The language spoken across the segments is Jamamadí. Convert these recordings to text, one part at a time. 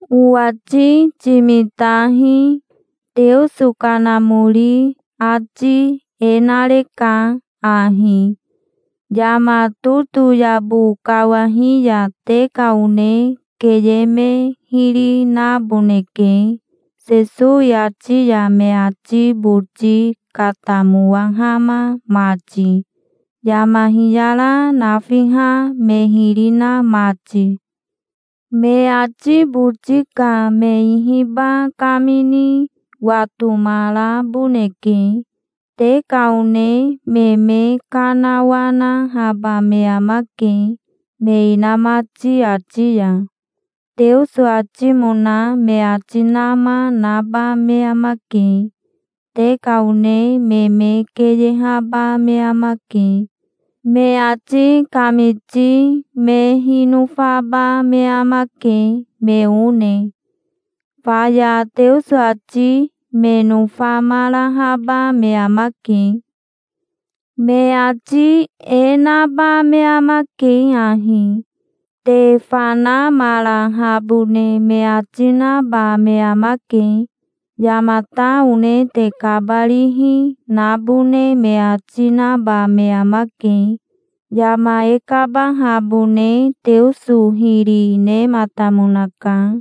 Owati timitahi. Teoso Kanamori ati e nareka ahi: yama totoyabo kawahi ya te ka one keye me hiri naboneke, Sesowi ati ya me ati boti katamowahama mati, yama hiyara nafiha me hiri na mati. Me ati boti ka me ihiba kamini watomaraboneke. Te ka one me me kanawanahaba me amake me inamati ati ya. Teoso atimona me ati nama naba me amake. Te ka one me me keyehaba me amake. Me ati kamiti me hinofaba me amake, me one. Faya Teoso ati me nofamarahaba me amake. Me ati e naba me amake ahi: te fanamarahabone me ati naba me amake. Yamata one te kabarihi nabone me ati naba me amake. Yama e kabahabone Teoso hiri nematamonaka,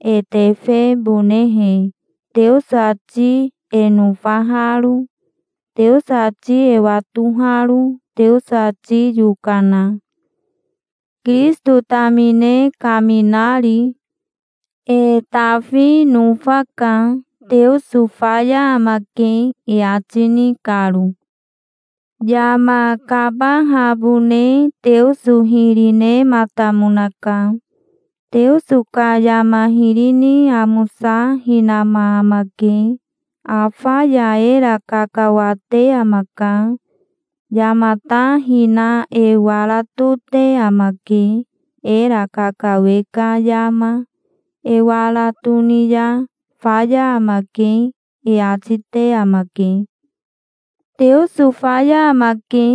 e tefebonehe, Teoso ati e nofaharo, Teoso ati e watoharo, Teoso ati yokana, Kirisito tamine kaminari. E tafi nofaka, "Teoso faya amake", e ati ni karo. Yama kabahabone Teoso hiri nematamonaka. Teoso ka yama hiri ni amosa hinama amake. Afa ya era kakawate amaka. Yama ta hina e wara tote amake. Era kakawe ka yama e wara toni ya, "Faya amake", e ati te amake. "Teoso faya amake",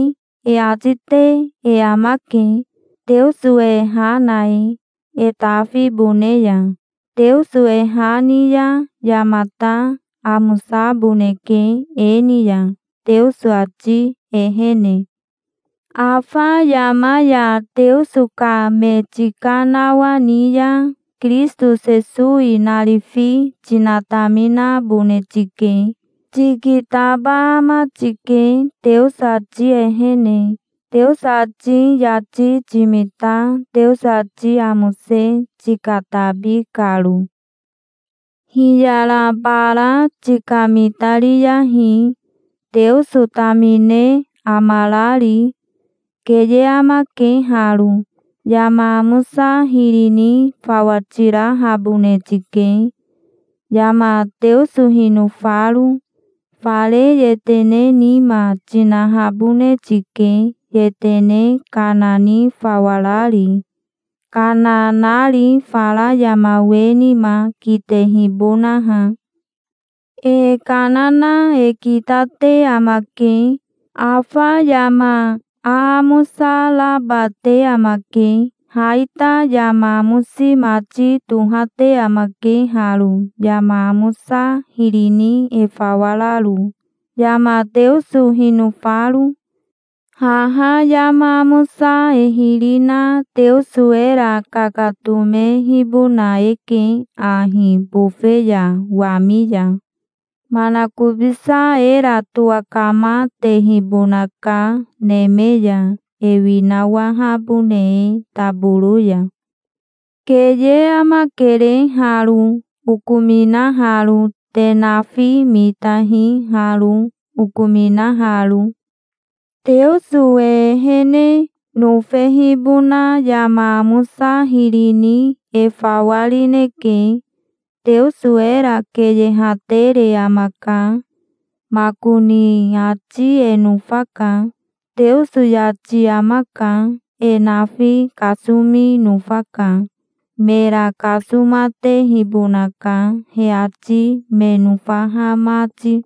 e ati te e amake, Teoso e ha na e, e tafibone ya. Teoso e ha ni ya yamata amosaboneke e ni ya, Teoso ati ehene. Afa yama ya Teoso ka me tikanawani ya Kirisito Sesowi narifi tinataminabone tike. Tikitaba ama tike Teoso ati ehene, Teoso ati yati timita Teoso ati amose tikatabi karo. Hiyara bara tikamitariyahi, Teoso tamine amarari. Keye amake haro. Yama amosa hiri ni fawa tirahabone tike, yama Teoso hinofaro. Fare yetene nima tinahabone tike, yetene kana ni fawa rari, kana nari fara yama we nima, kitehibonaha. E kana na e kitate amake. Afa yama aamosa raba te amake. Ha ita yama amosi mati tohate amake haro yama amosa hiri ni e fawa raro, yama Teoso hinofaro. Haha yama amosa e hiri na Teoso era kakatomehibona eke ahi bofe ya wami ya. Manakobisa era towakamatehibonaka neme ya, e winawahabone e taboro ya. Keye amakere haro, okominaharo. Te nafi mitahi haro, okominaharo. Teoso e ehene nofehibona yama amosa hiri ni e fawa rineke. Teoso era keyehatere amaka makoni ati e nofaka. Teoso yati amaka. E nafi kasomi nofaka. Mera kasomatehibonaka, he ati me nofaha mati.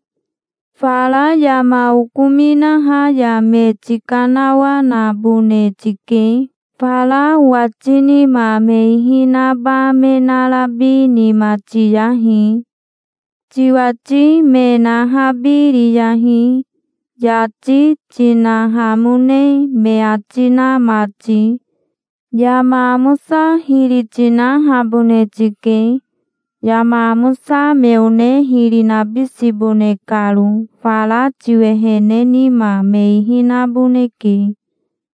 Fara yama okominaha ya me tikanawanabone tike. Fara owati nima me ihi naba me narabi nima tiyahi. Tiwati me nahabiriyahi, yati tinahamone me ati na mati. Yama amosa hiri tinahabone tike, yama amosa me one hiri nabisibone karo. Fara tiwehene nima me ihi naboneke.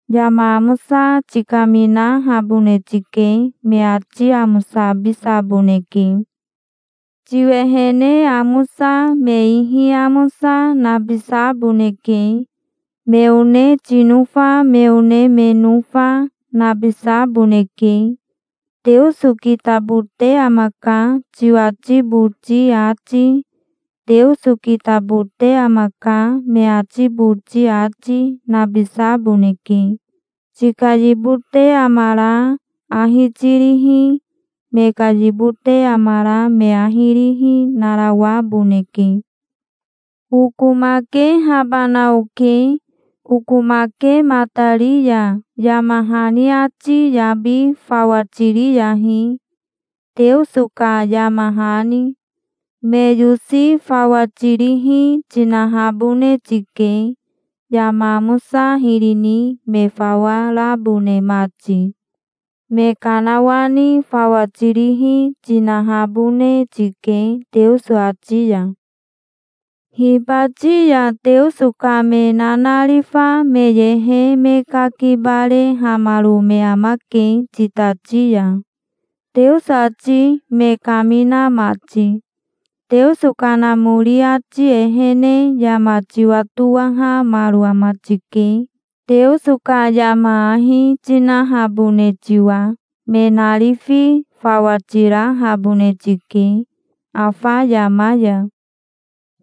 Yama amosa tikaminahabone tike. Me ati amosabisaboneke. Tiwehene amosa, me ihi amosa, nabisaboneke. Me one tinofa, me one me nofa, nabisaboneke. "Teoso kitabote amaka", tiwati boti ati, "Teoso kitabote amaka", me ati boti ati, nabisaboneke. Tika yibote amara ahi tirihi, me ka yibote amara me ahi rihi, narawaboneke. Okomakehabana oke. Okomakematari ya yama hani ati yabi fawa tiriyahi, Teoso ka yama hani. Me yosi fawa tirihi tinahabone tike, yama amosa hiri ni me fawa rabone mati. Me kanawani fawa tirihi tinahabone tike Teoso ati ya. Hibati ya Teoso ka me nanarifa me yehe me kakibarehamaro me amake titati ya, Teoso ati me kamina mati. Teoso Kanamori ati ehene yama tiwatowahamaro ama tike, Teoso ka yama ahi tinahabone tiwa. Me narifi fawa tirahabone tike, afa yama ya.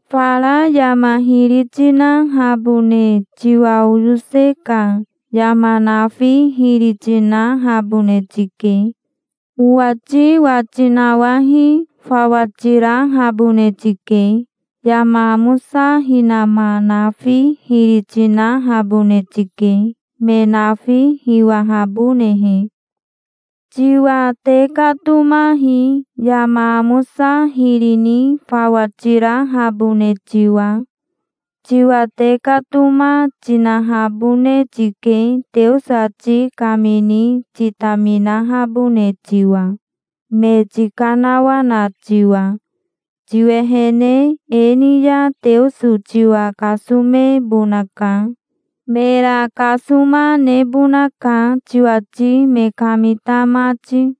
Fara yama hiri tinahabone tiwa oyose ka yama nafi hiri tinahabone tike. Owati wati nawahi fawa tirahabone tike. Yama amosa hinama nafi hiri tinahabone tike, me nafi hiwahabonehe. Tiwa tekatomahi, yama amosa hiri ni fawa tirahabone tiwa. Tiwa tekatoma tinahabone tike, Teoso ati kamini titaminahabone tiwa, me tikanawana tiwa. Tiwehene e ni ya Teoso tiwa kasomebonaka. Mera kasoma nebonaka tiwati me kamita mati.